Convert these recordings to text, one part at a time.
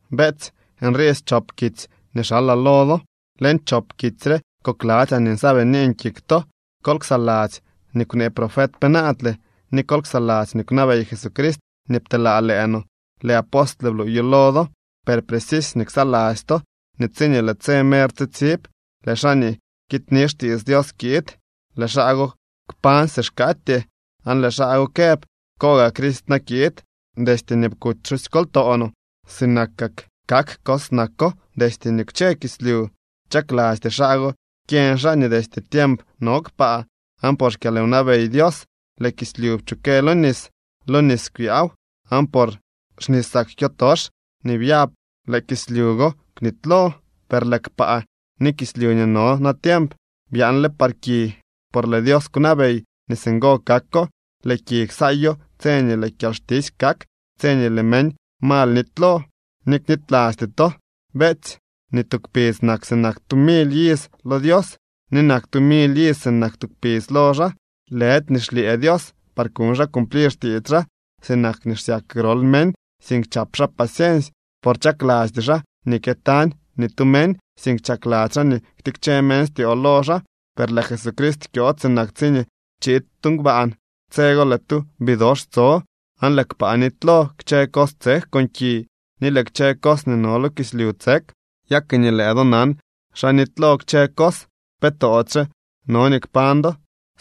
Beetsy, nrii schop kitsy nii xalaa lo do. Leñ chop kitsy re kokladzyaa nii nsaabinin kik to. Kol ksaladzy nii kwnee profet penaadle, ni kol ksaladzy nii kwnabey Jesucrist nii pteelaa lëë no. Lëë apostle bluuyo lo do. Per precisy nii ksaladzy to nii tsiñee lëë tse mer tsitsib, lëë xaa nii kidyni xtiits Dios kiid, lëë xaa go kpañ si xkaatyee, aan lëë xaa go këb: “¿Koo gaa Crist na kiid? Destye nii kuty pxosykoltoo no, sinak kak cos nako destye nii kwche kislyu.” Chaklasty xaa go kyeñ xaa nii destye tiemp no kpaa, aan por xkyalwnabey Dios lëë kislyu pchukë lo nis, lo nis kwyaaw. Aan por xnisak kyotox nii byab lëë kislyu go kwnitylo. Per lëë kpaa ni kislyu nii no natiemp byaanle par ki por lëë Dios kwnabey nii singo kako. Lëë ki ksaayo tse nii lëë kyalxtisy kak, tse nii lëë meñ mal nitylo. Ni knitylasty to, beetsy, nii tu kpidz nak sinak tu mily iz lo Dios, ni nak tu mily iz sinak tu kpidz lo xaa. Lëdy nii xlyëë Dios par kuñ xaa cumplir xtiits xaa, sinak nii xsyak grol meñ, sink chap xaa paciensy, por chaklasty xaa nii kyëtañ ni tu meñ, sink chakladzy xaa nii ktikche meñ styoo lo xaa. Per lëë Jesucrist kyood sinak tsiñee chiid tu ngbaan. Tse go lëë tu bidox tso aan lëë kpaa nitylo, kchë cos tsek con ki, ni lëë kchë cos nii no lo kislyu tsek. Ya ke nii lëë do nan xa nitylo kchë cos, ¿pe toodyxe no nii kpañ do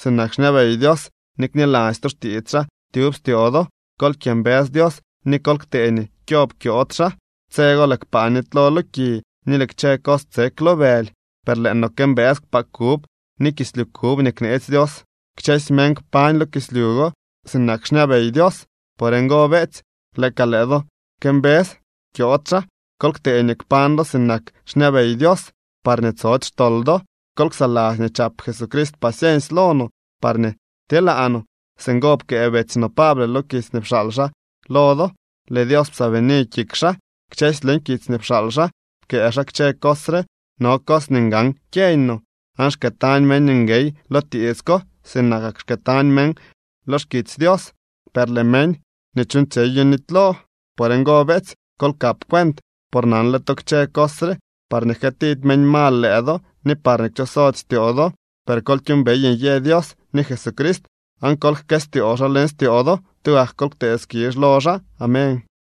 sinak xñabey Dios, ni kniladzy to xtiits xaa tyub styoo do? Kol kyëmbës Dios ni kol ktee nii kyob kyood xaa. Tse go lëë kpaa nitylo lo ki ni lëë kchë cos tsek lo bëly, per lëë no këmbës kpaa kub ni kislyu kub nii kneetsy Dios. Kchësy meñ kpañ lo kislyu go sinak xñabey Dios. Por ngo, beetsy, lëë ka lëë do këmbës kyood xaa, kol ktee nii kpañ do sinak xñabey Dios parñee tsody xtol do. Kol ksaladzy nii chap Jesucrist paciensy lo no parñee tyeelaa no. Singo pkëë betsy no Pable lo kitsy nii pxaal xaa lo do. Lëë Dios psaabini kik xaa. Kchësy leñ kitsy nii pxaal xaa pkëë xaa kchë cos re. No cos nii ngan kyeeñ no, aan xkëëtañ meñ nguey lo tiits ko, sinakak xkëëtañ meñ lo xkitsy Dios, per lëë meñ nii chuuñtsyeyo nitylo. Por ngo, beetsy, kol kap cuent, por nanle to kchë cos re parñee jkëëtidy meñ mal lëë do ni parñee kchosody styoo do. Per kol kyuumbey nyë Dios ni Jesucrist aan kol jkëstyoo xaa leñ styoo do. ¡Tugak kol ktee skizh lo xaa! Amén.